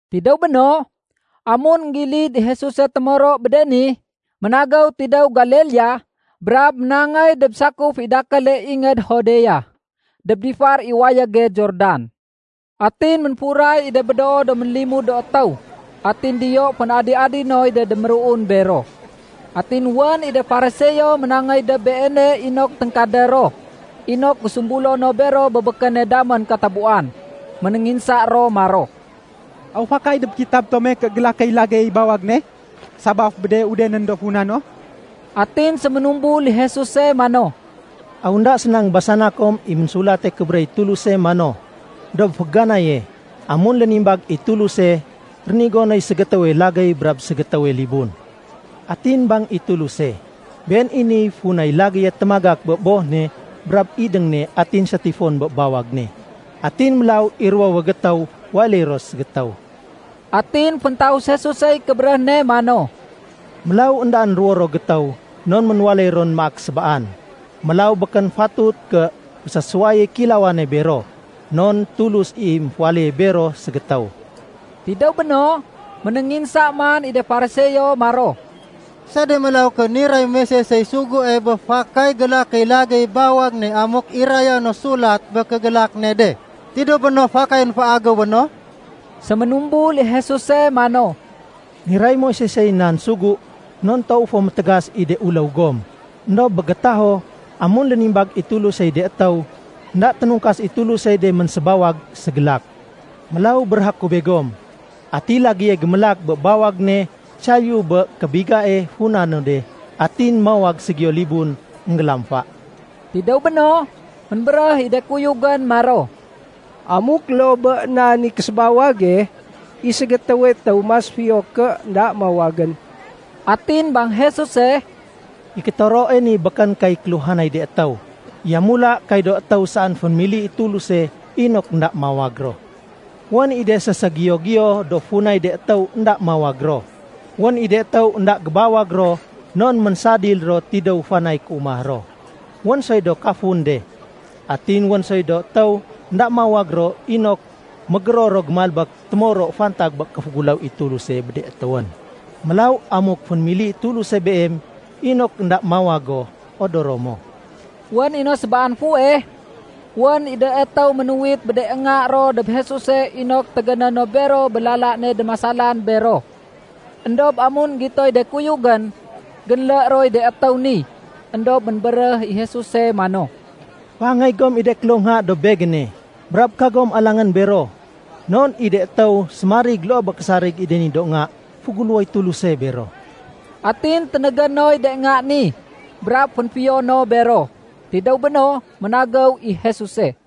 Tidéw béno, amun énggilid i Jesuse témoro bé de ni, ménagéw tidéw Galilea brab ménangéy dob sakuf i dakéle ingéd Judea dob difar i wayége Jordan. Atin ménfuray i de médoo do ménlimud do étéw. Atin diyo fén-adi-adi noy de déméruun bero. Atin wén i de Fariseo ménangéy dob Beene inok téngkadé ro inok gésumbulo no bero bé békéne damén katabuwan. Ménénginsa ro maro, “Aw fakay dob kitab tome ké gélakéy lagéyey bawag ne sabaf bé de udenén do funa no?” Atin séménumbul i Jesuse mano, “Aw énda séna énggébasana kom i Ménsulate Kébéréh i Tuluse mano, ‘Dob féganaye, amun léménimbag i Tuluse, rénigo noy ségétéwe lagéy brab ségétéwe libun.’ Atin bang i Tuluse, ‘Been i niy funay lagéye témagak bé boh ne brab idéng ne atin sétifon bé bawag ne. Atin mélaw i ruwowe gétéw waléy ro ségétéw.’” Atin féntaus Jesusey kébéréh ne mano, “Mélaw éndaén ruwo ro gétéw non ménwaléy ron maak sébaan. Mélaw békén fatut ké fésésuwayéy kéilawane bero, non Tulus i ménféwaléye bero ségétéw.” Tidéw béno, ménénginsa man i de Fariseo maro, “Sede mélaw ké niray Moisesey sugue bé fakay gélakéy lagéyey bawag ne amuk iraya no sulat bé kégélak ne de, tidéw béno fakayén féagéwé no?” Séménumbul i Jesuse mano, “Niray Moisesey nan sugu non toow fo métégas i de uléw gom. Endob bé gétaho, amun lénimbag i Tulusey de étéw, énda ténungkas i Tulusey de ménsébawag ségélak. Mélaw béréhé ku begom, ati lagéye gémélak bé bawag ne saliyu bé kébigae funa no de, atin mawag ségiyo libun, énggélamfa.” Tidéw béno, ménbéréh i de kuyugén maro, “Amuk loo bé nan i késébawage, i ségétéwe étéw mas fiyo ké énda mawagén.” Atin bang Jesuse, “I kétoroe ni békén kay kéluhanay de étéw. Yamula kay do étéw saén fénémili i Tuluse inok énda mawag ro. Wén i de séségiyo-giyo do funay de étéw énda mawag ro. Wén i de étéw énda gébawag ro non ménsadil ro tidéw fanay kéumah ro. Wén soy do kafun de. Atin wén soy do étéw énda mawag ro inok mégéror ro gémalbék témoro fantag bé kéféguléw i Tuluse bé de étéwén. Mélaw amuk fénémili i Tuluse beem inok énda mawag go, odoro mo.” Wén i no sébaan fuweh, wén i do étéw ménuwit bé de nga ro dob Jesuse inok tégéné no bero bé lala ne démasalan bero. Endob amun énggitoy de kuyugén, génlé roy de étéw ni. Endob ménbéréh i Jesuse mano, “Féangéy gom i de kloh nga dob Begéne. Brab kagom alangén bero, non i de étéw sémarig loo bé késarig i de ni do nga, féguléwoy Tuluse bero.” Atin ténégé noy de nga ni brab fénfiyo no bero. Tidéw béno, ménagéw i Jesuse.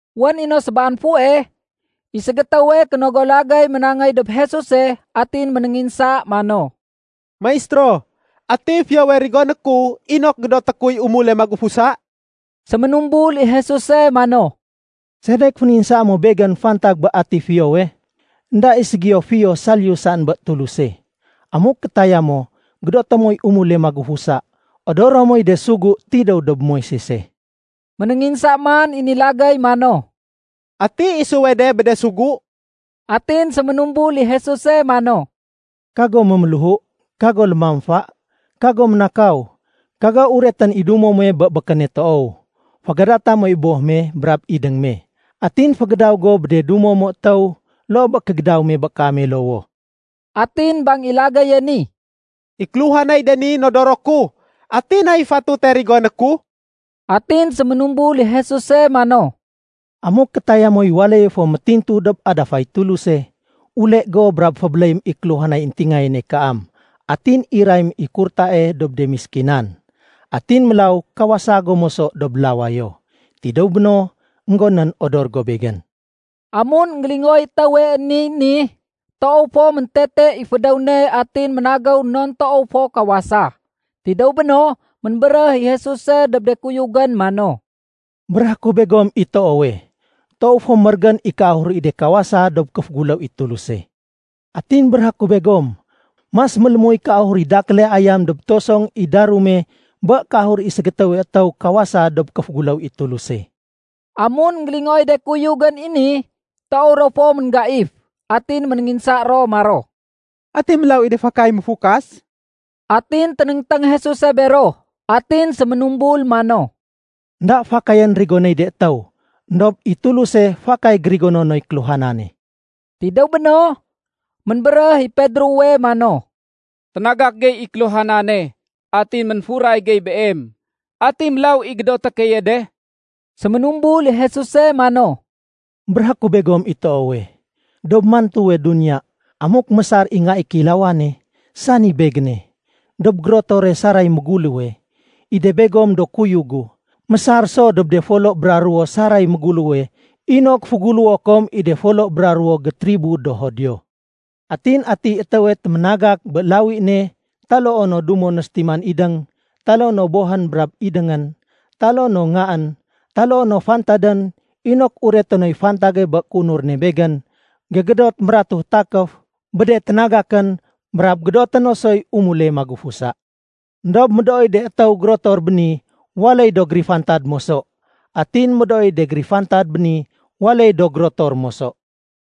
Wén i no sébaan fuweh, i ségétéwe kénogo lagéy ménangéy dob Jesuse atin ménénginsa mano, “Maistéro, ati fiyowe rigoné ku inok gédoté kuy umule magufusa?” Séménumbul i Jesuse mano, “Sedek fénginsaa mo Begén fantag bé ati fiyowe? Enda i ségiyo fiyo saliyu saén bé Tuluse. Amuk kétaya mo gédoté moy umule magufusa, odoro moy de sugu tidéw dob Moisese.” Ménénginsa man i ni lagéy mano, “Ati isuwe de bé de sugu?” Atin séménumbul i Jesuse mano, “Kago méméléhu, kago lémamfa, kago ménakaw, kago uretén i dumo muwe bé békéne toow, fégadata moy boh me brab idéng me, atin fégédaw go bé de dumo mo étéw loo bé kégédaw me bé kaame lowoh.” Atin bang i lagéye ni, “I kéluhanay de ni nodoro ku. Ati nay fatute rigoné ku?” Atin séménumbul i Jesuse mano, “Amuk kétaya moy waléye fo métintu dob adafay Tuluse, ule go brab fébéléyém i kéluhanay éntingayéne kaam atin irayém i kurtae dob de méskinan. Atin mélaw kawasa go moso dob lawayo. Tidéw béno, énggonén, odor go Begén.” Amun énggélingooy étéwe niy ni, toow fo méntete i fédéw ne atin ménagéw non toow fo kawasa. Tidéw béno, ménbéréh i Jesuse dob de kuyugén mano, “Béréhé ku begom i toowe, toow fo mérégén i kéahur i de kawasa dob kéféguléw i Tuluse. Atin béréhé ku begom, mas mélémuy kéahur i dakéle ayam dob tosong i darume bé kéahur i ségétéwe étéw kawasa dob kéféguléw i Tuluse.” Amun énggélingooy de kuyugén i ni, toow ro fo ménggaif. Atin ménénginsa ro maro, “Ati mélaw i de fakay méfukas?” Atin ténéngténg Jesuse bero atin séménumbul mano, “Enda fakayén rigonéy de étéw, éndob i Tuluse fakay gérigono noy kéluhanane.” Tidéw béno, ménbéréh i Pedrowe mano, “Ténagak gey i kéluhanane atin ménfuray gey Beem. Ati mélaw i gédoté keye de?” Séménumbul i Jesuse mano, “Béréhé ku begom i toowe, dob mantuwe duniya amuk mésar i Nga i Kéilawane, sani Begéne, dob gérotore saray méguléwe, i de begom do kuyug gu mésar so dob de folo bra ruwo saray méguléwe inok féguléwo kom i de folo bra ruwo gétribo do Judio. Atin atiy étéwe téménagak bé lawi ne taloo no dumo no sétiman idéng, taloo no bohén brab idéngén, taloo no ngaén, taloo no fantadén inok ureté noy fantage bé kéunur ne Begén, gégédot mératuh takéf bé de ténagakén brab gédoté no soy umule magufusa. Endob médooy de étéw gérotor béni waléy do gérifantad moso. Atin médooy de gérifantad béni waléy do gérotor moso.”